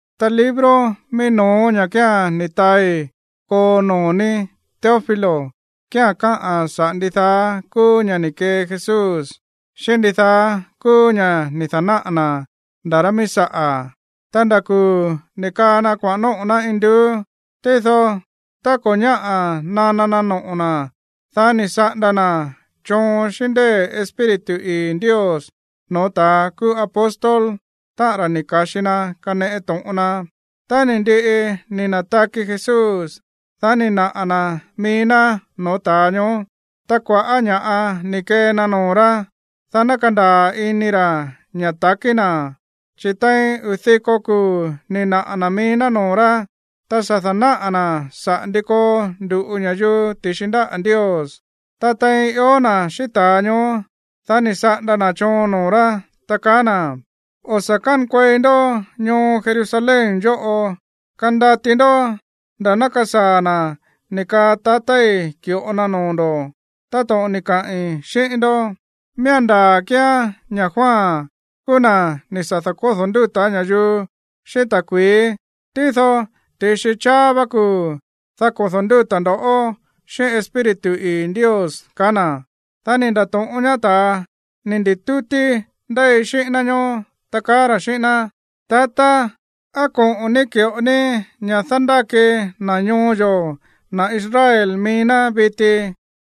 Ta libro mií no̱ó ña̱ kía̱n ni̱ taai koo noo̱ ní, Teófilo, kía̱n káꞌa̱n saꞌa̱ ndidaá kúú ña̱ ni̱ kee Jesús, xíꞌín ndidaá kúú ña̱ ni̱ da̱náꞌa̱ na̱ nda̱ rá míí saꞌa̱, ta nda̱ kuu̱ ni̱ kaa na kuaꞌa̱n nóꞌo̱ ná induú. Tído tá ko̱ ñáꞌa̱ nana na noꞌo̱ na̱, dá ni̱ saꞌanda na̱ choon xíꞌín ndée̱ Espíritu ii̱ Ndios no̱ó ta̱ kúú apóstol, táꞌa̱n ra̱ ni̱ ka̱xi na kaneꞌe to̱ꞌon na. Tá ni̱ ndiꞌi ni̱ na̱taki Jesús, dá ni̱ naꞌa̱ na̱ mií ná no̱ó ta̱a ñoó. Ta kua̱ꞌá ña̱ꞌa ni̱ kee na noo̱ rá, dá ná kandaa̱ ini ra̱ ña̱ ta̱kí na̱. Chi̱ tein uu̱ diko kuu̱ ni̱ naꞌa̱ na̱ mií noo̱ rá, ta sa̱ da̱náꞌa̱ na̱ saꞌa̱ ndi koo ndu̱ꞌu ña̱yuu ti̱xi ndáꞌa̱ Ndios. Ta tein ió na̱ xíꞌín ta̱a ñoó, dá ni̱ saꞌanda na̱ choon noo̱ rá, ta kaá na̱: ―O̱ sa̱ kánkuei ndó ñoo Jerusalén yóꞌo. Kandati ndó nda̱ ná kasaa̱ na̱ ni̱ kaa tatái̱ ki̱ꞌo na noo̱ ndo̱, táto̱ꞌon ni̱ kaꞌi̱n xíꞌín ndó. Miía̱n ndaa̱ kíán ña̱ Juan kúú na̱ ni̱ sa̱ da̱kódo̱ ndúta̱ ña̱yuu xíꞌín ta̱kui̱í. Tído ti̱xi cháá vá kuu̱, dá kodo̱ ndúta̱ ndo̱ xíꞌín Espíritu ii̱ Ndios ―kaá na̱. Dá ni̱ nda̱to̱ꞌón ñaá ta̱ ni̱ ndi̱tútí ndéi xíꞌín ná ñoó, ta kaá ra̱ xíꞌín ná: ―Tatá, ¿á koꞌo̱n ní ki̱ꞌo ní ña̱ dándáki na̱ ñoo yo̱, na̱ Israel mií ná viti?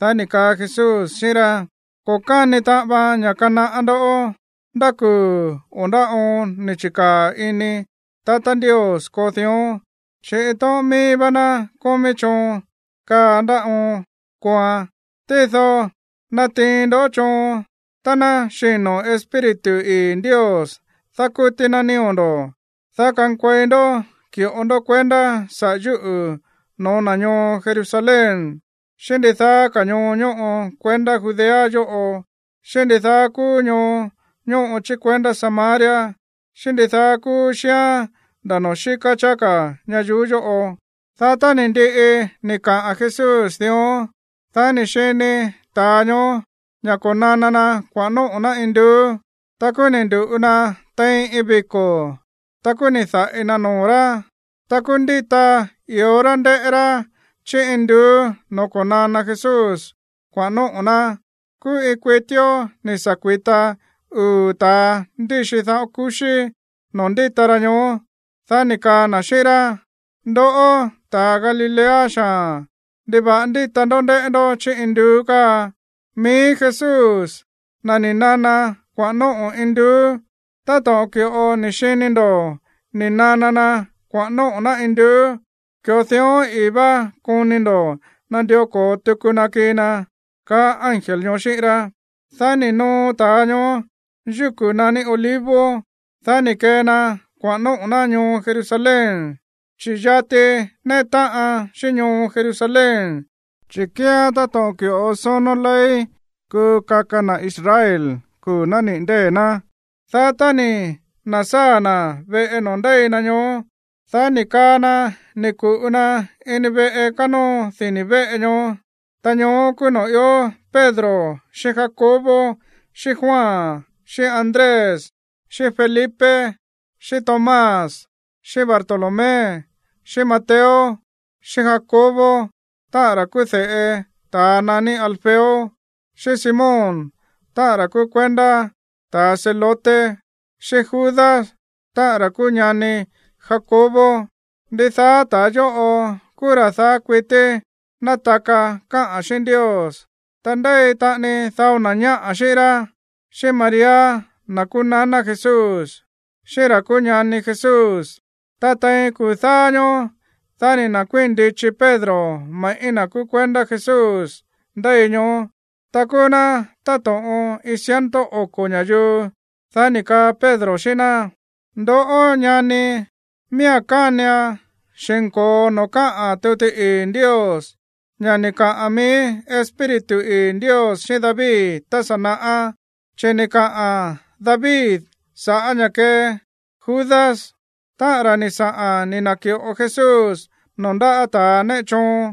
Dá ni̱ kaa Jesús xíꞌín rá: ―Ko̱ káni taꞌan vaan ña̱ kanaꞌá ndoꞌó ndá kuu̱ o ndá oon ni̱ chi̱kaa̱ ini tatá Ndios koo dión, chi̱ iin tóꞌón mií vá ná kómí choon kaa ndá oon kooan. Tído natiin ndó choon tá ná xino̱ Espíritu ii̱ Ndios dákútí ná nío̱ ndo̱, dá kankuei ndó ki̱ꞌo ndó kuendá sa̱ꞌá yúꞌu̱ no̱ó na̱ ñoo Jerusalén, xíꞌín ndidaá ka̱ ñoo ñóꞌo kuendá Judea yóꞌo, xíꞌín ndidaá kúú ñoo ñóꞌo chí kuendá Samaria, xíꞌín ndidaá kúú xíán nda̱ noo̱ xíká cháá ka̱ ñayuú yóꞌo. Dá tá ni̱ ndiꞌi ni̱ kaꞌa̱n Jesús dión, dá ni̱ xini ta̱a ñoó ña̱ ko̱nana na kuaꞌa̱n nóꞌo̱ ná induú. Ta kúú ni̱ ndu̱ꞌu na tein iin viko̱. Ta kúú ni̱ da̱ꞌi na noo̱ rá. Ta kúú ndíta i̱ó rá ndéꞌé rá chí induú no̱ó ko̱nana Jesús kuaꞌa̱n nóꞌo̱ ná. Kúú iin kuitíó ni̱ sa̱ kui̱ta uu̱ ta̱a ndíxi daꞌón kuxí noo̱ ndíta ra ñoó. Dá ni̱ kaa na̱ xíꞌín rá: ―Ndoꞌó, ta̱a Galilea xaa̱n, ¿ndiva̱ꞌa ndíta ndoꞌó ndéꞌé ndó chí induú káa? Mií Jesús, na̱ ni̱ nana kuaꞌa̱n nóꞌo̱ induú, táto̱ꞌon ki̱ꞌo ni̱ xini ndo̱ ni̱ nana na kuaꞌa̱n nóꞌo̱ ná induú, ki̱ꞌo dión ii̱ vá koni ndo̱ nandió ko̱o tuku na kii na ―kaá ángel ñoó xíꞌín rá. Dá ni̱ noo ta̱a ñoó yúku̱ naní Olivos, dá ni̱ kee na kuaꞌa̱n nóꞌo̱ ná ñoo Jerusalén, chi̱ yati néꞌe táꞌan xíꞌín ñoo Jerusalén, chi̱ kíán táto̱ꞌon ki̱ꞌo sónó ley kuu kaka na̱ Israel kuu̱ nániꞌi̱ ndée̱ ná. Dá tá ni̱ na̱sáa̱ na̱ veꞌe noo̱ ndéi na ñoó, dá ni̱ kaa na ni̱ ku̱ꞌu na ini veꞌe kánóo dini̱ veꞌe ñoó. Ta ñoó kúú noo̱ ió Pedro xíꞌín Jacobo, xíꞌín Juan, xíꞌín Andrés, xíꞌín Felipe, xíꞌín Tomás, xíꞌín Bartolomé, xíꞌín Mateo, xíꞌín Jacobo, táꞌa̱n ra̱ kúú de̱ꞌe ta̱a naní Alfeo, xíꞌín Simón, táꞌa̱n ra̱ kúú kuendá ta̱ Zelote, xíꞌín Judas, táꞌa̱n ra̱ kúú ñani Jacobo. Ndidaá ta̱a yóꞌo kúú ra̱ daá kuití nátaka káꞌa̱n xíꞌín Ndios, ta ndéi taꞌani dao na̱ ñáꞌa̱ xíꞌín rá, xíꞌín María, na̱ kúú naná Jesús, xíꞌín ra̱ kúú ñani Jesús. Ta tein kuu̱ dáá ñóó, dá ni̱ na̱kuíi̱n ndichi Pedro me̱ꞌí na̱ kúú kuendá Jesús ndéi ñoó. Ta kúú ná táto̱ꞌon iin ciento oko̱ ña̱yuu. Dá ni̱ kaa Pedro xíꞌín ná: ―Ndoꞌó, ñani, miía̱n kánian xi̱nko̱o noo̱ káꞌa̱n tuti ii̱ Ndios, ña̱ ni̱ kaꞌa̱n mií Espíritu ii̱ Ndios xíꞌín David tá sa̱ naꞌá. Chi̱ ni̱ kaꞌa̱n David sa̱ꞌá ña̱ kee Judas, táꞌa̱n ra̱ ni̱ saꞌa̱n ni̱ na̱ki̱ꞌo Jesús noo̱ ndáꞌa̱ ta̱ néꞌe choon.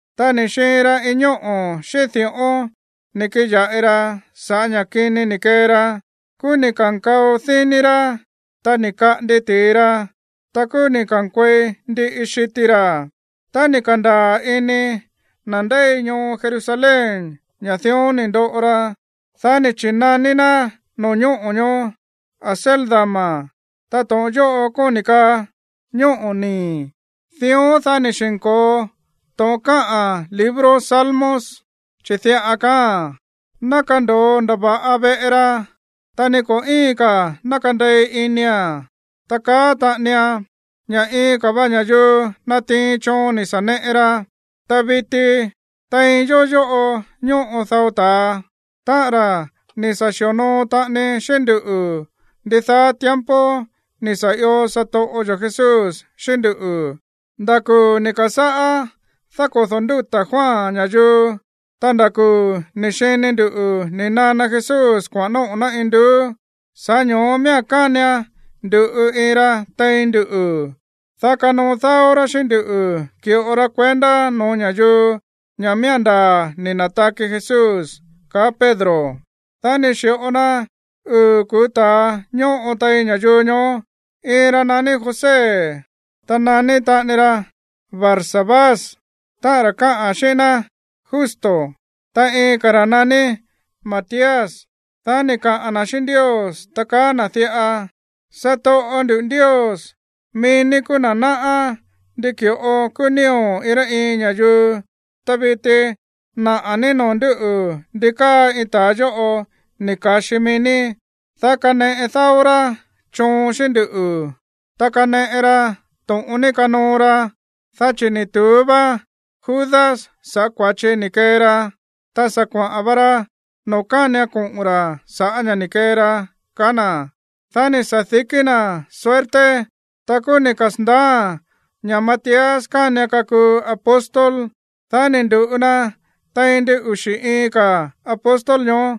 ’Ta ni̱ xiin ra iin ñóꞌo̱ xíꞌín di̱ꞌón ni̱ kiꞌin ya̱ꞌi ra sa̱ꞌá ña̱ kini ni̱ kee ra. Kúú ni̱ ka̱nkao díní rá, ta ni̱ kaꞌandi ti̱i ra, ta kúú ni̱ ka̱nkuei ndiꞌi xiti ra̱. Tá ni̱ ka̱ndaa̱ ini na̱ ndéi ñoo Jerusalén ña̱ dión ni̱ ndoꞌo ra, dá ni̱ chi̱naní ná no̱ñóꞌo̱ ñoó Acéldama. Ta to̱ꞌon yóꞌo kóni̱ kaa Ñóꞌo̱ Nii̱. Dión, dá ni̱ xi̱nko̱o to̱ꞌon káꞌa̱n libro Salmos, chi̱ diꞌa kaáa̱n: Ná kando̱o ndava̱ꞌa veꞌe ra. Ta ni ko̱ íin ka̱ ná kandei inia̱n. Ta kaá taꞌanian: Ña̱ iin ka̱ va ña̱yuu natiin choon ni̱ sa̱ neꞌe ra. ’Ta viti tein yó yóꞌo ñóꞌo dao ta̱a, táꞌa̱n ra̱ ni̱ sa̱ xi̱onoo taꞌani xíꞌín nduꞌu̱ ndidaá tiempo ni̱ sa̱ io satoꞌo yo̱ Jesús xíꞌín ndú, nda̱ kuu̱ ni̱ ka̱sáꞌá dákodo̱ ndúta̱ Juan ña̱yuu, ta nda̱ kuu̱ ni̱ xini ndu̱ ni̱ nana Jesús kuaꞌa̱n nóꞌo̱ ná induú. Sa̱ꞌá ño̱ó miía̱n kánian ndu̱ꞌu iin ra tein nduꞌu̱, dá kanoo dáó rá xíꞌín nduꞌu̱ ki̱ꞌo ra kuendá no̱ó ña̱yuu ña̱ miía̱n ndaa̱ ni̱ na̱taki Jesús ―kaá Pedro. Dá ni̱ xi̱ꞌo na uu̱ kuu̱ ta̱a ñóꞌo tein ña̱yuu ñoó. Iin ra̱ naní José, ta naní taꞌani ra Barsabás, táꞌa̱n ra̱ káꞌa̱n xíꞌín ná Justo, ta iin ka̱ ra̱ naní Matías. Dá ni̱ kaꞌa̱n na̱ xíꞌín Ndios, ta kaá na̱ diꞌa: ―Satoꞌo ndu̱ Ndios, mií ní kúú na̱ náꞌá ndi ki̱ꞌo kúú nío̱ iin rá iin ña̱yuu. Ta viti naꞌa̱ ní noo̱ ndúꞌu̱ ndi káa iin ta̱a yóꞌo ni̱ ka̱xi mií ní, dá kaneꞌe dáó rá choon xíꞌín nduꞌu̱, ta kaneꞌe ra to̱ꞌon ní kanoo ra, dá chi̱ ni̱ tu̱ú vá Judas sa̱ꞌá kua̱chi ni̱ kee ra. Ta sa̱ kuaꞌa̱n va ra noo̱ kánian koꞌo̱n ra̱ sa̱ꞌá ña̱ ni̱ kee ra ―kaá na̱. Dá ni̱ sa̱dikí na̱ suerte. Ta kúú ni̱ kasa̱ndaáa̱n ña̱ Matías kánian kakuu apóstol. Dá ni̱ ndu̱ꞌu na tein ndin uxi̱ iin ka̱ apóstol ñoó.